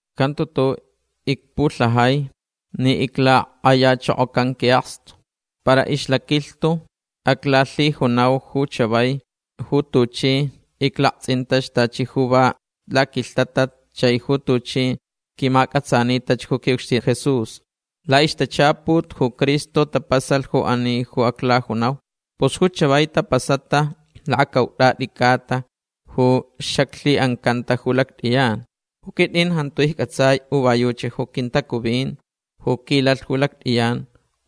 Jantu tu'u' icpulhajai ni iclak'ayachokocan qui'akstu. Para ixlaquilhtu aclalhijunau ju chavai ju tuchi iclakts'intach tachi ju va laquilhtatat chai ju tuchi quimac'atsanitach ju qui'ucxtin Jesús. La'ixtachaput ju Cristo tapasalh ju ani ju aclajunau. Pus ju chavai tapasata lakacaut'at'i c'ata ju xaclhi'ancanta ju lact'iyan. Ju quit'in jantu icc'atsai u va yuchi ju quintacuvin ju quilalh ju lact'iyan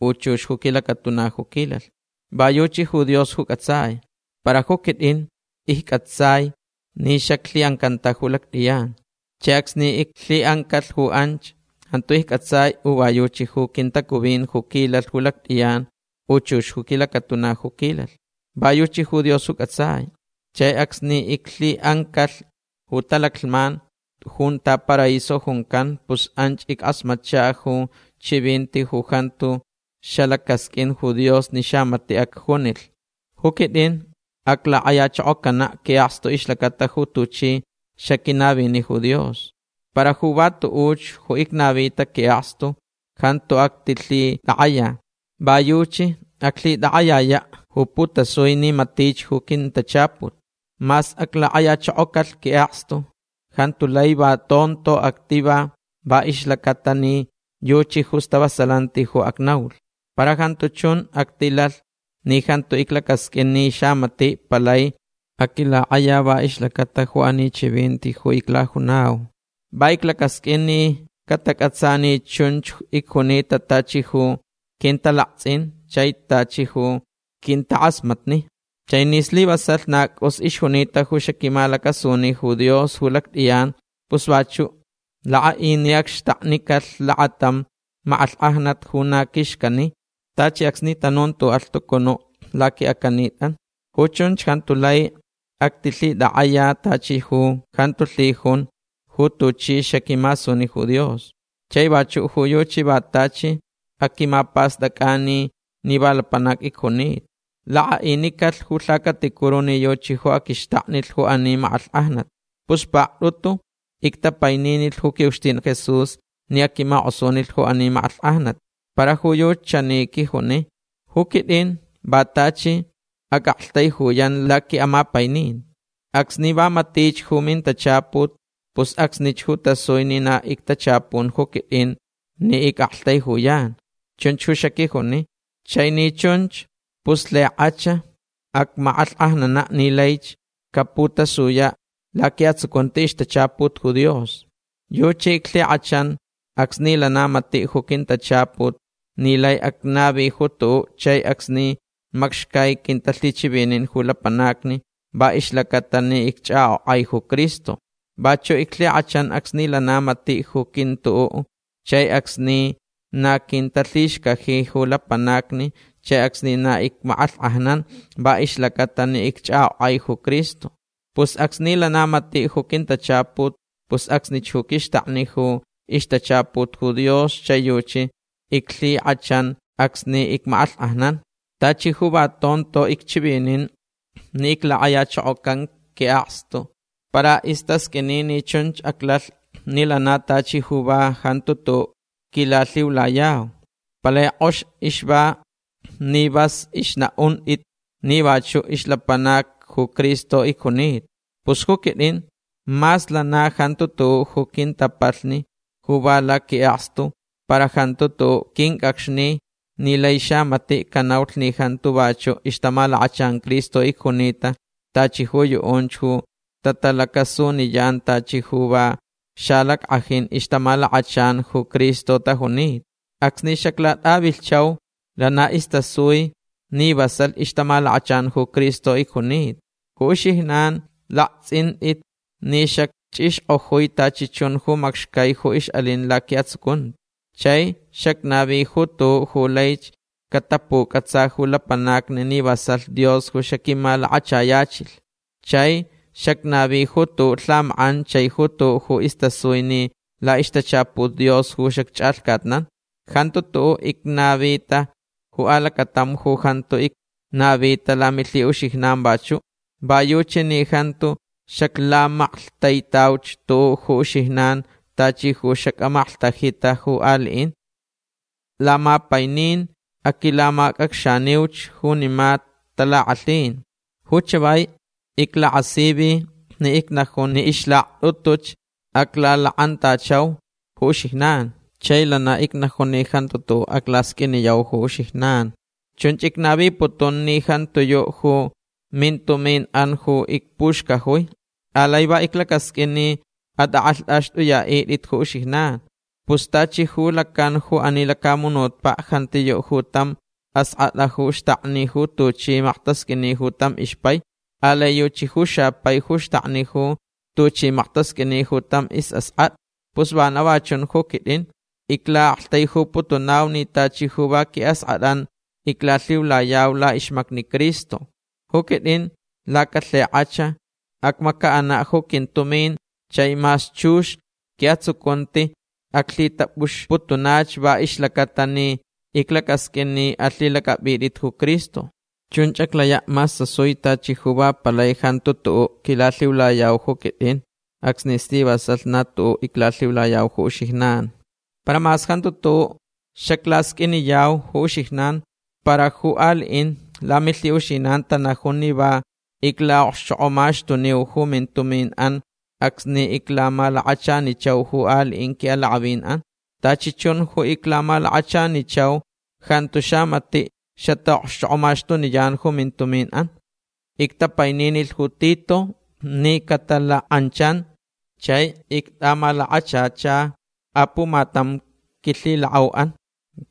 u chux ju quilacatuna ju quilalh. Va yuchi ju Dios ju c'atsai. Para ju quit'in icc'atsai ni xaclhi'ancanta ju lact'iyan. Chai acsni iclhi'ancalh ju anch jantu icc'atsai u va yuchi ju quintacuvin ju quilalh ju lact'iyan u chux ju quilacatuna ju quilalh. Va yuchi ju Dios ju c'atsai. Chai acsni iclhi'ancalh ju talaclhman junta paraíso juncan pus anch ick'asmatcha ju chivinti ju jantu xalacasq'uin ju Dios ni xamati' acjunilh. Ju quit'in aclak'ayachokocana' qui'akstu ixlacata ju tuchi xaquinavi ju Dios. Para ju va tu'uch ju icnavita qui'akstu jantu actilhitak'aya. Va yuchi aclhitak'ayaya' ju putasui ni matich ju quintachaput. Mas aclak'ayachokocalh qui'akstu jantu lai va tonto activa va ixlaca'atalh ni yuchi ju stavasalanti ju acnaulh. Para jantu chun actilalh ni jantu iclacasq'uin ni xamati' palai aquilak'aya va ixlacata ju ani quinchivinti ju iclajunau. Va iclacasq'uin ni catac'atsa ni chunch icjunita tachi ju quintalakts'in chai tachi ju quintak'asmatni. Chai ni slivasalh na c'us ixjunita ju xaquimalacasuni ju Dios ju lact'iyan pus vachu' lak'a'i ni acxtaknicalh lakatam mak'alhk'ajnat ju na quixcani tachi acsni tanun tu'u' alhtucunu' laqui'acanit'an. Ju chunch jantu lai actilhitak'aya tachi ju jantu lhijun ju tuchi xaquimasuni ju Dios. Chai vachu' ju yuchi va tachi aquimapast'ac'ani ni va lapanac icjunita. Lak'a'inicalh ju lhacaticuru ni yuchi ju aquixtaknilh ju ani mak'alhk'ajnat. Pus pakt'utu ictapaininilh ju qui'ucxtin Jesús ni aquimak'osunilh ju ani mak'alhk'ajnat. Para ju yuchi chani quijuni: “Ju quit'in va tachi ac'aktaijuyan laqui'amapaininti. Acsni va matich ju mintachaput pus acsnich ju tasui ni na ictachapun ju quit'in ni ic'aktaijuyan”. Chunch ju xaquijuni. Chai ni chunch pus lhik'ach acmak'alhk'ajnana' ni laich caputasuyach laqui'atsucunti ixtachaput ju Dios. Yuchi iclhik'achan acsni lana matich ju quintachaput ni lai acnavilh ju tu'u' chai acsni macxcai quintalhichivinin ju lapanacni va ixlaca'atalh ni icch'ak'ok'ai ju Cristo. Vachu' iclhik'achan acsni lana mati' ju quintu'u' chai acsni na quintalhixcajich ju lapanacni chai acsni na icmak'alhk'ajnan va ixlaca'atalh ni icch'ak'ok'ai ju Cristo. Pus acsni lana matich ju quintachaput pus acsnich ju quixtakni ju ixtachaput ju Dios chai yuchi iclhik'achan acsni icmak'alhk'ajnan. Tachi ju va tonto icchivinin ni iclak'ayachokocan qui'akstu. Para istasq'uini ni chunch aclalh ni lana tachi ju va jantu tu'u' quilalhiulayau. Palai k'ox ixva ni vas ixna'unt'it ni vachu' ixlapanac ju Cristo icjunita. Pus ju quit'in mas lana jantu tu'u' ju quintapalhni ju va laqui'akstu para jantu tu'u' quinc'acxni ni lai xamati' canaulh ni jantu vachu' ixtamalakachan Cristo icjunita tachi ju yu'unch ju tatalacasuniyan tachi ju va xalack'ajin ixtamalakachan ju Cristo tajunita. Acsni xaclat'avilhchau lana istasui ni vasalh ixtamalakachan ju Cristo icjunta. Ju uxijnan lakts'int'it ni xacch'ixk'ojui tachi chun ju macxai ju ix'alin laqui'atsucunti. Chai xacnavi ju tu'u' ju laich catapuc'atsa ju lapanacni ni vasalh Dios ju xaquimalakachayachilh chai xacnavi ju tu'u' lhamak'an chai ju tu'u' ju istasui ni la'ixtachaput Dios ju xacch'alhcatnan. Jantu tu'u' icnavita ju alacatam ju jantu icnavita lamilhi'uxijnan'an vachu'. Va yuchi ni jantu xaclamaklhtaitauch tu'u' ju uxijnan tachi ju xac'amaklhtajita ju ali'in. Lamapainin aquilamac'acxaniuch junima talak'alhin. Ju chavai iclakasivi ni icnajun ni ixlakt'utuch aclalak'antachauch ju uxijnan. Chai lana icnajun ni jantu tu'u' aclasq'uiniyau ju uxijnan. Chunch icnaviputun ni jantiyu' ju mintumin'an ju icpuxcajui. Alai va iclacasq'uin ni at'ak'alht'axt'uya'it'it ju uxijnan. Pus tachi ju lacan ju ani lacamunutpa' jantiyu' ju tam ask'at'a ju xtakni ju tuchi maktasq'uini ju tam ixpai. Alai yuchi ju xapai ju xtakni ju tuchi maktasq'uini ju tam is'ask'at'a. Pus vana va chun ju quit'in. Icla'aktaijuputunau ni tachi ju va qui'ask'at'an iclalhiulayau la'ixmacni Cristo. Ju quit'in lacalhik'ach acmaca'ana' ju quintumin chai mas chux qui'atsucunti aclhitap'uxputunach va ixlaca'atalh ni iclacasq'uin ni alhilac'ap'it'it ju Cristo. Chunch aclaya' mas tasui tachi ju va palai jantu tu'u' quilalhiulayau ju quit'in acsni slivasalh na tu'u' iclalhiulayau ju uxijnan. Para mas jantu tu'u' xaclasq'uiniyau ju uxijnan para ju ali'in lamilhi'uxijnan tanajun ni va icla'okxchok'omaxtuniu ju mintumin'an acsni iclamalakachanichau ju ali'in qui'alak'avin'an. Tachi chun ju iclamalakachanichau jantu xamati' xata'okxchok'omaxtuniyan ju mintumin'an. Ictapaininilh ju Tito ni catalak'anchan. Chai ict'amalakachacha apumatam quilhilak'au'an.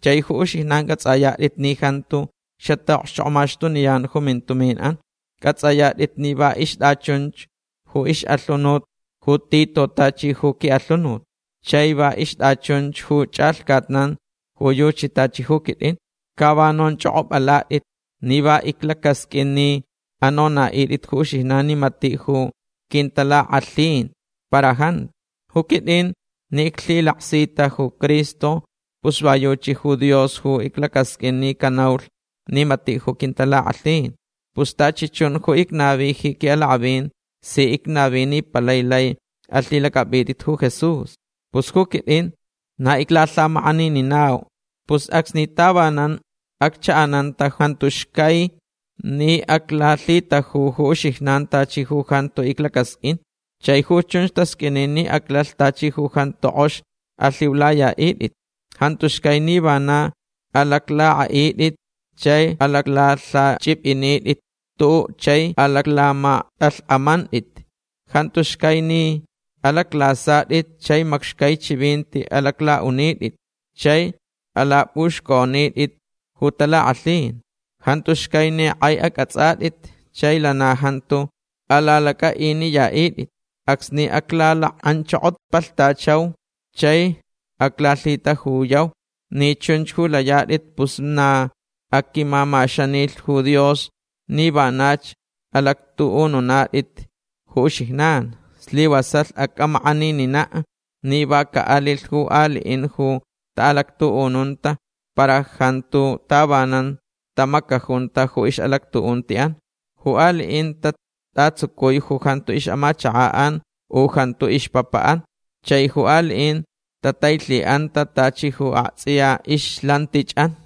Chai ju uxijnan c'ats'ayat'it ni jantu xata'okxchok'omaxtuniyan ju mintumin'an. C'ats'ayat'it ni va ixt'achunch ju ix'alhunut ju Tito tachi ju qui'alhunut. Chai va ixt'achunch ju ch'alhcatnan ju yuchi tachi ju quit'in. Ca va nonch'ok'op'alat'it ni va iclacasq'uin ni anona'it'it ju uxijnan ni mati' ju quintalak'alhin. Para jantu. Ju quit'in ni iclhilaksita ju Cristo pus va yuchi ju Dios ju iclacasq'uin ni canaulh ni mati' ju quintalak'alhin. Pus tachi chun ju icnavi ji qui'alak'avin si icnavi ni palai lai alhilac'ap'it'it ju Jesús. Pus ju quit'in na iclalhamak'anininau. Pus acsni tavanan accha'ananta jantu xcai ni aclalhitaju ju uxijnan tachi ju jantu iclacasq'uin. Chai ju chun tasq'uini ni aclalh tachi ju jantu k'ox alhiulaya'it'it. Jantu xcai ni vana alaclak'a'it'it chai alaclalhacchip'init'it tu'u' chai alaclamakt'alhk'amant'it. Jantu xcai ni alaclasat'it chai macxcai chivinti alacla'unit'it chai alap'uxc'onit'it ju talak'alhin. Jantu xcai ni k'ai ac'ats'at'it chai lana jantu alalac'a'iniyat'it. Acsni aclalak'anchokopalhtachau chai aclalhitajuyau ni chunch ju layat'it pus na aquimamaxanilh ju Dios ni vanach alactu'ununat'it ju uxijnan. Slivasalh ac'amak'aninina' ni va ca'alilh ju ali'in ju ta'alactu'ununta para jantu tavanan tamacajunta ju ix'alactu'unti'an. Ju ali'in tat'atsucui ju jantu ix'amachaka'an u jantu ixpapa'an. Chai ju ali'in tatailhi'anta tachi ju akts'iyach ixlantich'an.